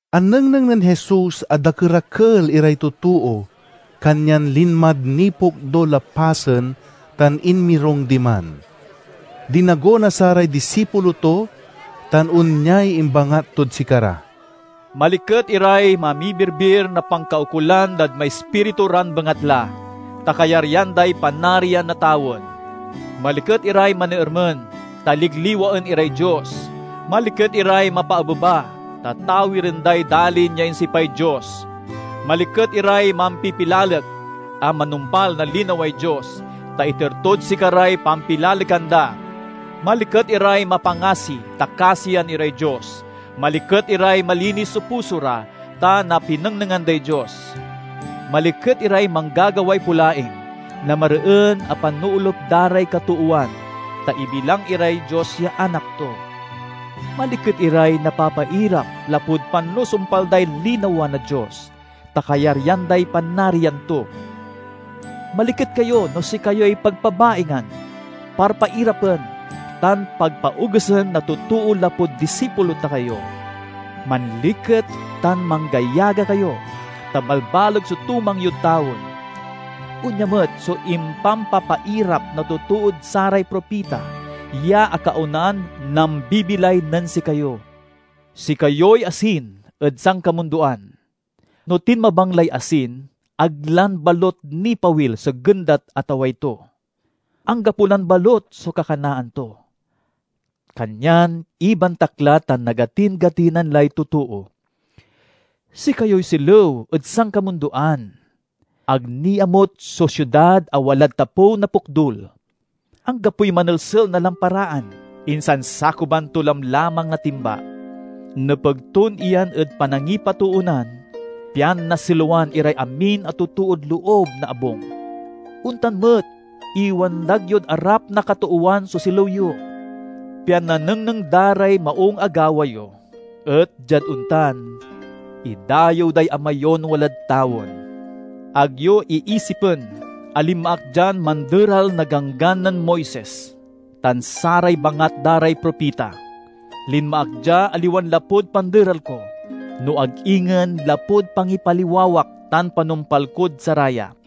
Anengneng nen Jesus a dakerakel iray totoo, kanyan linmad nipokdul a pasen tan inmirung diman. Dinago na saray disipulo to, tan onyay imbangat tod sikara: "Maliket iray mamibirbir na pankaukolan dad maispiritu ran bengatla, ta kayaryan day Panarian na tawen! "Maliket iray maneermen, ta ligliwaen iray Dios! "Maliket iray mapaabeba, ta tawiren day dalin ya insipay Dios! "Maliket iray mampipilalek a manumpal na linaway Dios, ta iter tod sikaray pampilalekan da! "Maliket iray mapangasi, ta kasian iray Dios! "Maliket iray malinis so puso ra, ta napinengnengan day Dios! "Maliket iray manggagaway polaing na mareen a panoolup da ray katoowan, ta ibilang iray Dios ya anak to! "Maliket iray napapairap lapud panusumpal day linawa na Dios, ta kayaryan day Panarian to! "Maliket kayo no sikayoy pabpabaingan, parpairapen, tan pagpaogesen na totoo lapud disipulo ta kayo. Manliket tan manggayaga kayo, ta balbaleg so tumang yod tawen. Onya met so impampapairap na totood saray propita ya akaonan nambibilay nen sikayo." "Sikayoy asin ed sankamundoan. No tinmabang lay asin, ag lan balut nipawil so gendat a taway to. Anggapo lan balut so kakanaan to, kanyan ibantak la tan nagatin-gatinan lay totoo. "Sikayoy silew ed sankamundoan. Ag niamut so siudad a walad tapew na pokdul. Anggapoy manelsel na lamparaan, insan sakuban to lamlamang na timba. Nepeg ton iyan ed, panangipatoonan pian nasilewen iray amin a totood loob na abung. Ontan met, iwandag yod arap na katoowan so silew yo, pian nanengneng da ray maung a gawa yo, et diad ontan, idayew day Ama yon walad tawen." "Ag yo iisipen a linma ak dian manderal na Ganggan nen Moises tan saray bangat da ray propita. Linma ak dia, aliwan lapud panderal ko, no ag ingen lapud pangipaliwawak tan panumpal kod saraya.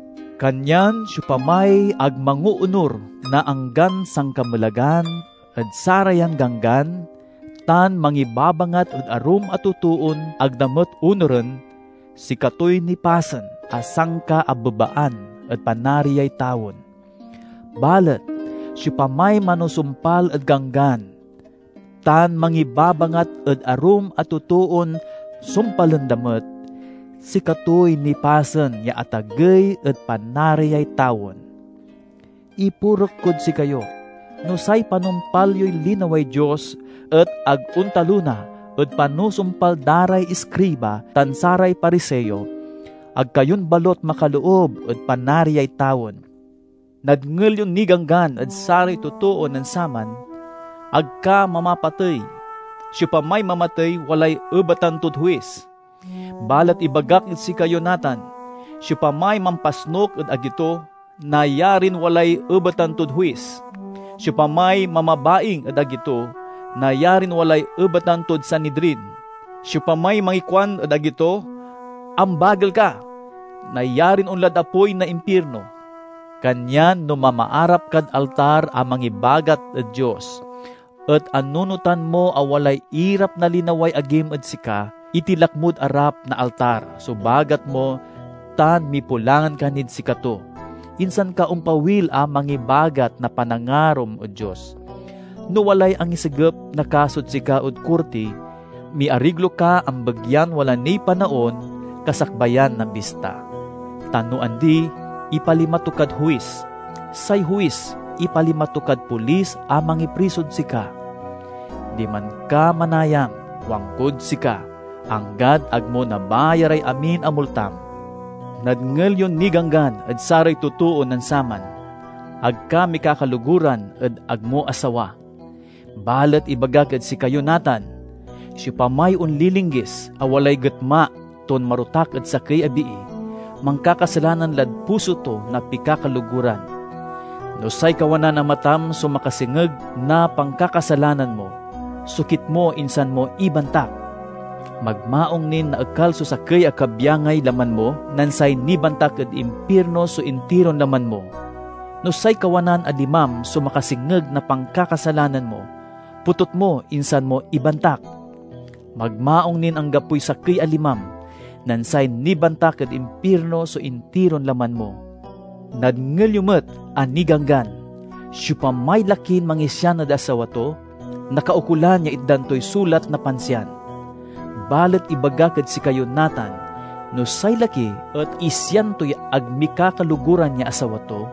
Kanyan siopamay ag mangoonur na anggan sankamelagan ed sarayan ganggan tan mangibabangat ed arum a totoon ag da met onuren, sikatoy nipasen a sankaabebaan ed Panariay tawen. Balet siopamay manusumpal ed Ganggan, tan mangibabangat ed arum a totoon sumpalen da met, sikatoy nipasen ya atagey ed Panariay tawen. Ipurek kod sikayo: no say panumpal yoy linaway Dios et ag ontalona ed panusumpal da ray iskriba tan saray Pariseo, ag kayon balut makaloob ed Panariay tawen." "Nadngel yon ninganggan ed saray totoo nen saman, 'Ag ka mamapatey; siopamay mamatey walay ebatan tod huis.' Balet ibagak ed sikayo natan: siopamay mampasnuk ed agi to, nayarin walay ebatan tod huis. Siopamay mamabaing ed agi to, nayarin walay ebatan tod Sanidrin. Siopamay mangikuan ed agi to, 'Ambagel ka!' nayarin onlad apoy na impirno. Kanyan no mamaarap kad altar a mangibagat ed Dios, et anunotan mo a walay irap na linaway agim ed sika, itilak mod arap na altar so bagat mo tan mipulangan ka nid sikato, insan ka ompawil a mangibagat na panangarom ed Dios. "No walay angisegep na kasod sika ed korti, miariglo ka ambegyan wala niy panaon, kasakbayan na bista. Ta no andi, ipalima to kad huis; say huis ipalima to kad polis a mangiprisod sika. Diman ka manayam, kuankod sika, anggad ag mo nabayaray amin a multam." "Nadngel yon niganggan ed saray totoo nen saman. 'Ag ka mikakaloguran ed ag mo asawa.' Balet ibagak ed sikayo natan: siopamay onlilinggis a walay getma ton marotak ed sakey a bii, mankakasalanan lad puso to na pikakaloguran. No say kawanan a matam so makasengeg na pankakasalanan mo, sokit mo insan mo ibantak! Magmaung nin naekal so sakey a kabyangay; laman mo, nen say nibantak ed impirno so intiron laman mo. No say kawanan a limam so makasengeg na pankakasalanan mo, potut mo insan mo ibantak! Magmaung nin anggapoy sakey a limam, nen say nibantak ed impirno so intiron laman mo." "Nadngel yo met a niganggan: 'Siopamay lakin mangisian ed asawa to, nakaukolan ya itdan toy sulat na pansiyan.' Balet ibagak ed sikayo natan: no say laki et isian toy ag mikakaloguran ya asawa to,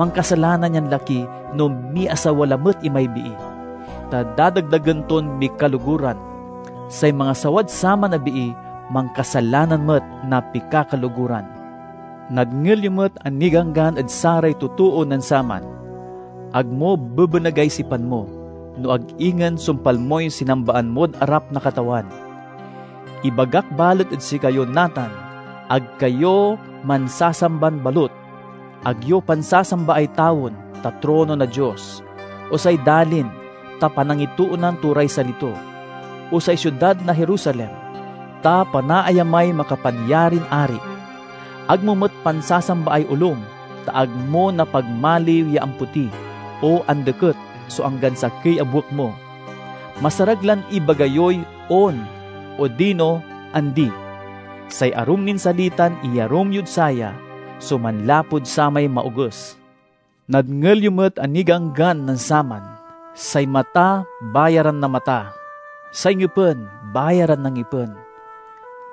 mankasalanan yan laki no miasawa lamet imay bii, ta dadagdagen ton mikaloguran. Say mangasawad saman a bii mankasalanan met na pikakaloguran." "Nadngel yo met a niganggan ed saray totoo nen saman, 'Ag mo bebenegay sipan mo, no ag ingen sumpal moy sinambaan mod arap na Katawan.' Ibagak balet ed sikayo natan: ag kayo mansasamban balut! Ag yo pansasambaay tawen, ta trono na Dios; o say dalin, ta panangitoonan to ray sali to; o say siudad na Jerusalem, ta panaayamay makapanyarin Ari. Ag mo met pansasambaay olom, ta ag mo napagmaliw ya ampoti o andeket so anggan sakey a buek mo. Masarag lan ibaga yoy 'On' odino 'Andi.' Say arum nin salitan iyarum yod saya so manlapud samay Maoges." "Nadngel yo met a niganggan nen saman, 'Say mata bayaran na mata; say ngipen bayaran na ngipen.'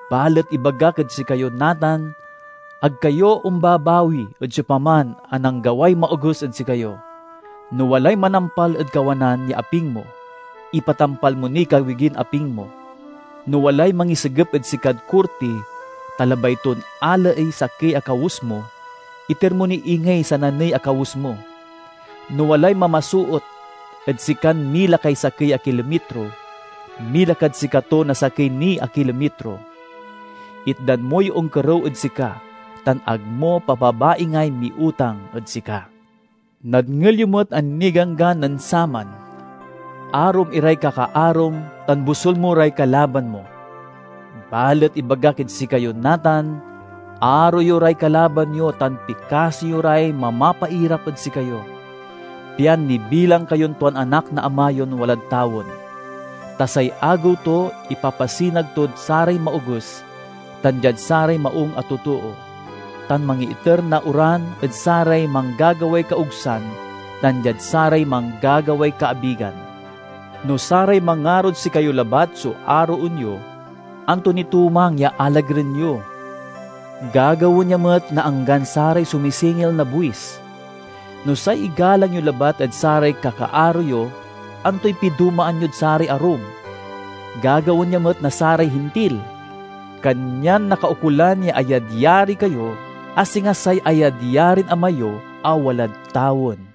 Balet ibagak ed sikayo natan: ag kayo ombabawi ed siopaman a nanggaway maoges ed sikayo. No walay manampal ed kawanan ya aping mo, ipatampal mo niy kawigin aping mo. No walay mangisegep ed sikad korti, ta labay ton alaey sakey a kawes mo, iter mo ni ingey sananey a kawes mo. No walay mamasoot ed sikan mila kay sakey a kilomitro, mila kad sikato na sakey ni a kilomitro. Itdan moy onkerew ed sika, tan ag mo papabaingay miutang ed sika." "Nadngel yo met a niganggan nen saman, 'Arom iray kakaarom tan bosul mo ray kalaban mo.' Balet ibagak ed sikayo natan: Aro yo ray kalaban yo tan pikasi yo ray mamapairap ed sikayo, pian nibilang kayon tuan anak na Ama yon walad tawen. Ta say agew to ipapasinag tod saray maoges tan diad saray maung a totoo, tan mangiiter na oran ed saray manggagaway kaogsan tan diad saray manggagaway kaabigan. No saray mangarod sikayo labat so aroen yo, anto ni tumang ya alagaren yo? Gagawaen ya met na anggan saray sumisingil na buis. No say igalang yo labat et saray kakaaro yo, antoy pidomaan yod saray arum? Gagawaen ya met na saray Hintil! Kanyan nakaukolan ya ayadyari kayo, a singa say ayadyarin Ama yo a walad tawen."